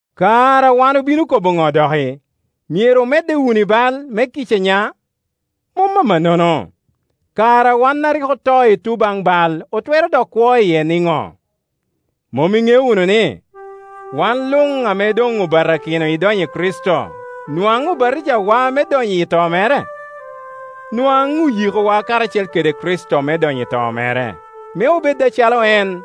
Kara wan obino kobo ŋo doki? Myero omedde wunu i bal, me kica nya? Mom amannono! Kara wan a rik oto i tun bal otwero dok kwo iye niŋo? Mom iŋeo wunu ni, wan luŋame doŋobatakino idonyo i Kricito nwaŋ obatŋawa me donyo i to mere? Nwaŋ oyikowa karacel kede Kricito me donyo i to mere, me obed acalo en.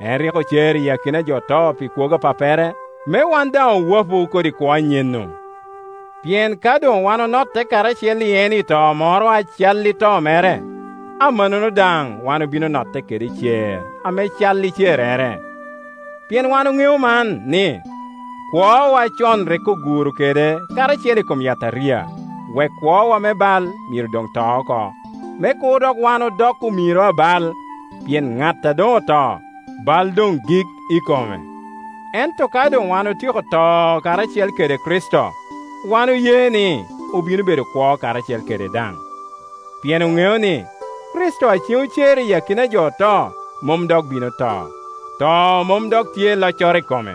En rik ocer i akina a jo oto pi kwogo a Pappere, me wan daŋ owapu kodi kwo anyen-nu. Pien ka doŋwan onotte karacel i en i to moro a cal i to mere, amanno daŋ wan obino notte kede i cer ame cal i cerrere. Pien wan oŋeo man, ni, kwowa acon rik oguro kede karacel i kom yataria, wek kwowa me bal myero doŋto oko, me kur dok wan odok omiro a bal. Pien ŋat a doŋoto, bal doŋgik i kome. Ento ka doŋwan otyeko to karacel kede Kricito, wan oye ni, obino bedo kwo karacel kede daŋ. Pien oŋeo ni, Kricito a ceŋ ocer i akina a jo oto mom dok bino to; to mom dok tye i loccoro i kome.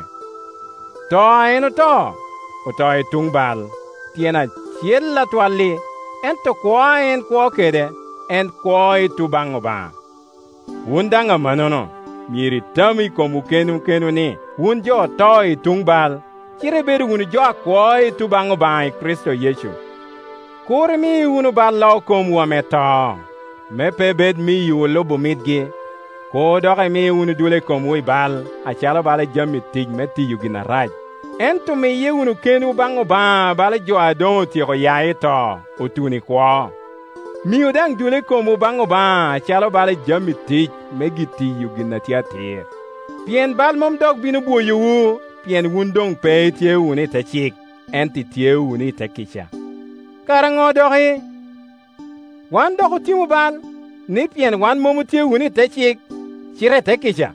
To a en oto, oto i tuŋ bal, tyen acel atwal-li; ento kwo a en kwo kede, en kwo i tuŋ baŋ Obaŋa. Wun daŋ amannono, myero itamu i komwu kenwu ni, wun jo oto i tun bal, cite ibedo wunu jo a kwo i tun baŋ Obaŋa i Kricito Yecu. Kur imi wunu bal lo komwu ame to, me pe bed miyowu lubo mitgi. Kur dok imi wunu dule komwu i bal, acalo bala jami tic me tiyo gin arac; ento miye wunu kenwu baŋ Obaŋa bala jo a doŋotyeko ya i to, otuno i kwo; miu daŋ dule komwu baŋ Obaŋa acalo bala jami tic me tiyo gin a tye atir. Pien bal mom dok bino bwoyowu, pien wun doŋ pe itye wunu i te cik, ento itye wunu i te kica. Kara ŋo doki? Wan doki otimu bal, ni pien wan mom otye i te cik cite i te kica?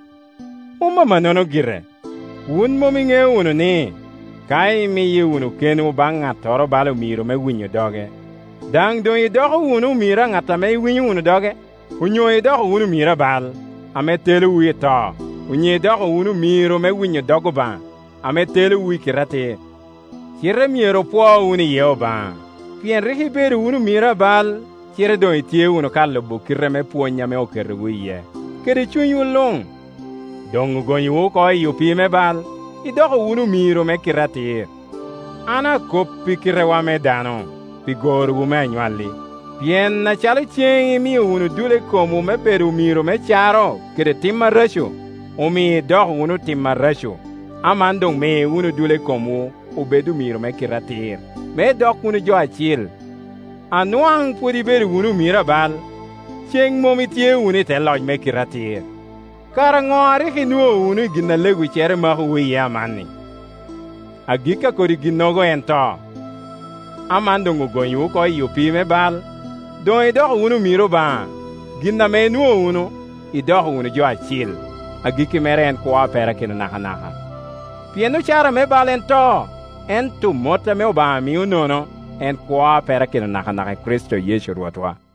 Mom amannono gire! Wun mom iŋeo wunu ni, ka imiye wunu kenwu baŋ ŋattoro bala omiro me winyo doge, daŋ doŋ idoko wunu omiro a ŋat ame iwinyo wunu doge? Onyo idoko wunu omiro a bal, ame telowu i to, onyo idoko wunu omiro me winyo dog Obaŋa, ame telowu i kite atir. Cite myero opwo iye Obaŋa, pien rik ibedo wunu omiro a bal, cite doŋ itye wunu ka lubo kite me pwony ame oketowu iye, kede cunywu luŋ. Doŋ ogonyowu oko i opii me bal, idoko wunu omiro me kite atir. An akop i kitewa me dano, pi gorowu me anywalli. Pien acalo ceŋ imio wunu dule komwu me bedo omiro me caro kede tim areco, omio idoko wunu otim areco, aman doŋ mi wunu dule komwu obed omiro me kite atir, me idok wunu jo acil. A nwaŋ pwod ibedo wunu omiro a bal, ceŋ mom itye wunu i te loc me kite atir. Kara ŋo a rik inwoŋo wunu i gin a lewiccere makowu iye amanni? Agikki a kodi ginnogo en to. Aman doŋ ogonyowu oko i opii me bal, doŋ idoko wunu omiro Obaŋa; gin ame inwoŋo wunu, idoko wunu jo acil, agikki mere en kwo a perakino nakanaka. Pien ocara me bal en to, ento mot ame Obaŋa mio nono en kwo a perakino nakanaka i Kricito Yecu Rwotwa.